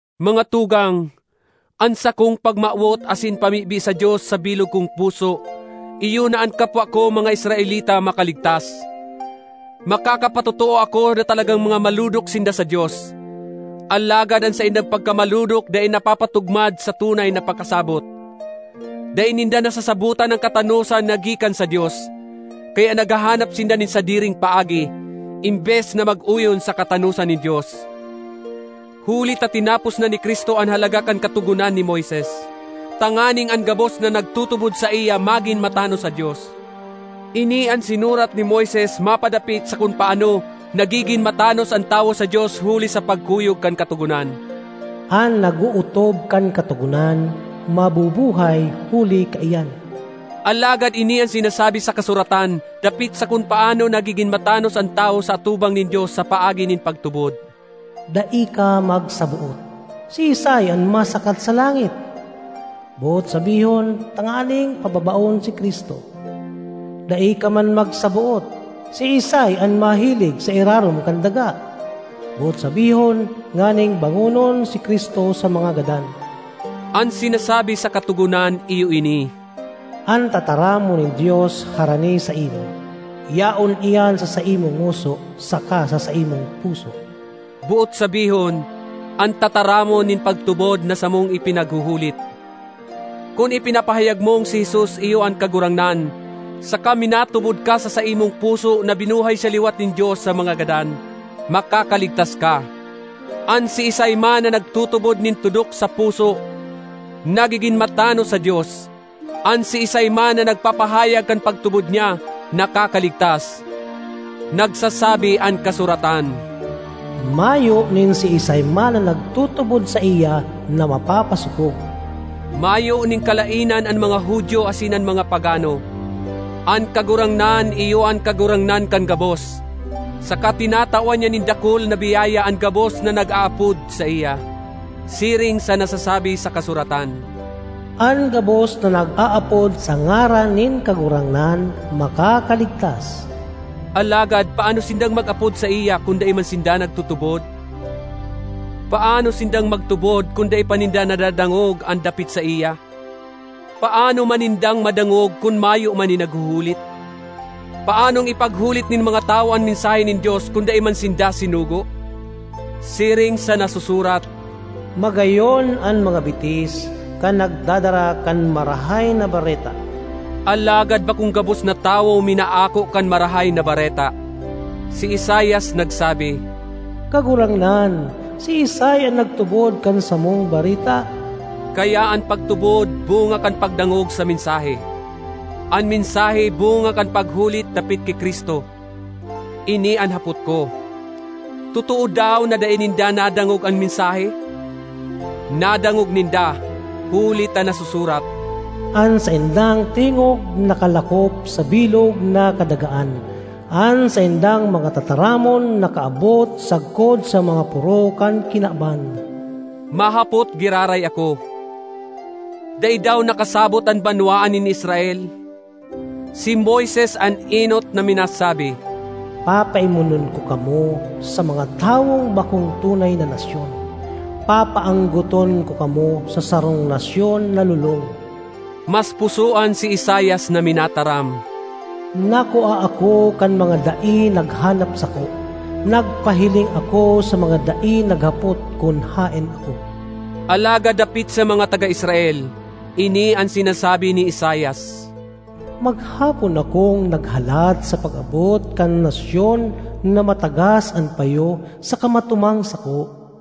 Mga tugang, an sakong pagmawot asin pamibi sa Dios sa bilog kong puso iyo na an kapwa ko mga Israelita makaligtas. Makakapatotoo ako na talagang mga malodok sinda sa Dios, alagad an saindang pagkamalodok dai napapatugmad sa tunay na pakasabot. Dai ninda nasasabotan an katanosan na gikan sa Dios, kaya naghahanap sinda nin sadiring paagi, embes na mag-oyon sa katanosan nin Dios. Huli ta tinapos na ni Cristo an halaga kan Katogonan ni Moises, tanganing an gabos na nagtutubod saiya magin matanos sa Dios. Ini an sinurat ni Moises mapadapit sa kun paano nagigin matanos an tawo sa Dios huli sa pagkuyog kan Katogonan: “An nag-ootob kan Katogonan mabubuhay huli kaiyan.” Alagad ini an sinasabi sa kasuratan dapit sa kun paano nagigin matanos an tawo sa atubang nin Dios sa paagi nin pagtubod: “Dai ka magsaboot, ‘Siisay an masakat sa langit?’” (boot sabihon, tanganing pababaon si Cristo). ”Dai ka man magsaboot, ‘Siisay an mahilig sa irarom kan daga?’” (boot sabihon, nganing bangonon si Cristo sa mga gadan). An sinasabi sa katogonan iyo ini: “An tataramon nin Dios harani saimo, yaon iyan sa saimong ngoso saka sa saimong puso.” —boot sabihon, an tataramon nin pagtubod na samong ipinaghuhulit. Kun ipinapahayag mong si Jesus iyo an Kagurangnan, saka minatubod ka sa saimong puso na binuhay siya liwat nin Dios sa mga gadan, makakaligtas ka. An siisay man na nagtutubod nin tudok sa puso, nagigin matanos sa Dios; an siisay man na nagpapahayag kan pagtubod niya, nakakaligtas. Nagsasabi an kasuratan, “Mayo nin siisay man na nagtutubod saiya na mapapasopog.” Mayo nin kalaenan an mga Judio asin an mga pagano; an Kagurangnan iyo an Kagurangnan kan gabos, saka tinatawan niya nin dakul na biyaya an gabos na nag-aapod saiya. Siring sa nasasabi sa kasuratan, “An gabos na nag-aapod sa ngaran nin Kagurangnan, makakaligtas.” Alagad paano sindang mag-apod saiya kun dai man sinda nagtutubod? Paano sindang magtubod kun dai pa ninda nadadangog an dapit saiya? Paano man nindang madangog kun mayo man nin naghuhulit? Paanong ipaghulit nin mga tawo an mensahe nin Dios kun dai man sinda sinugo? Siring sa nasusurat, “Magayon an mga bitis kan nagdadara kan Marahay na Bareta!” Alagad bakong gabos na tawo minaako kan Marahay na Bareta. Si Isaias nagsabi, “Kagurangnan, siisay an nagtubod kan samong bareta?” Kaya an pagtubod bunga kan pagdangog sa mensahe; an mensahe bunga kan paghulit dapit ki Cristo. Ini an hapot ko: Totoo daw na dai ninda nadangog an mensahe? Nadangog ninda, huli ta nasusurat, “An saindang tingog nakalakop sa bilog na kadagaan, an saindang mga tataramon nakaabot sagkod sa mga poro kan kinaban.” Mahapot giraray ako: Dai daw nakasabot an banwaan nin Israel? Si Moises an enot na minasabi, “Papaimonon ko kamo sa mga tawong bakong tunay na nasyon; papaanggoton ko kamo sa sarong nasyon na lolong.” Mas pusoan si Isaias na minataram, “Nakua ako kan mga dai naghanap sako; nagpahiling ako sa mga dai naghapot kun haen ako.” Alagad dapit sa mga taga Israel, ini an sinasabi ni Isaias, “Maghapon akong naghalat sa pag-abot kan nasyon na matagas an payo saka matumang sako.”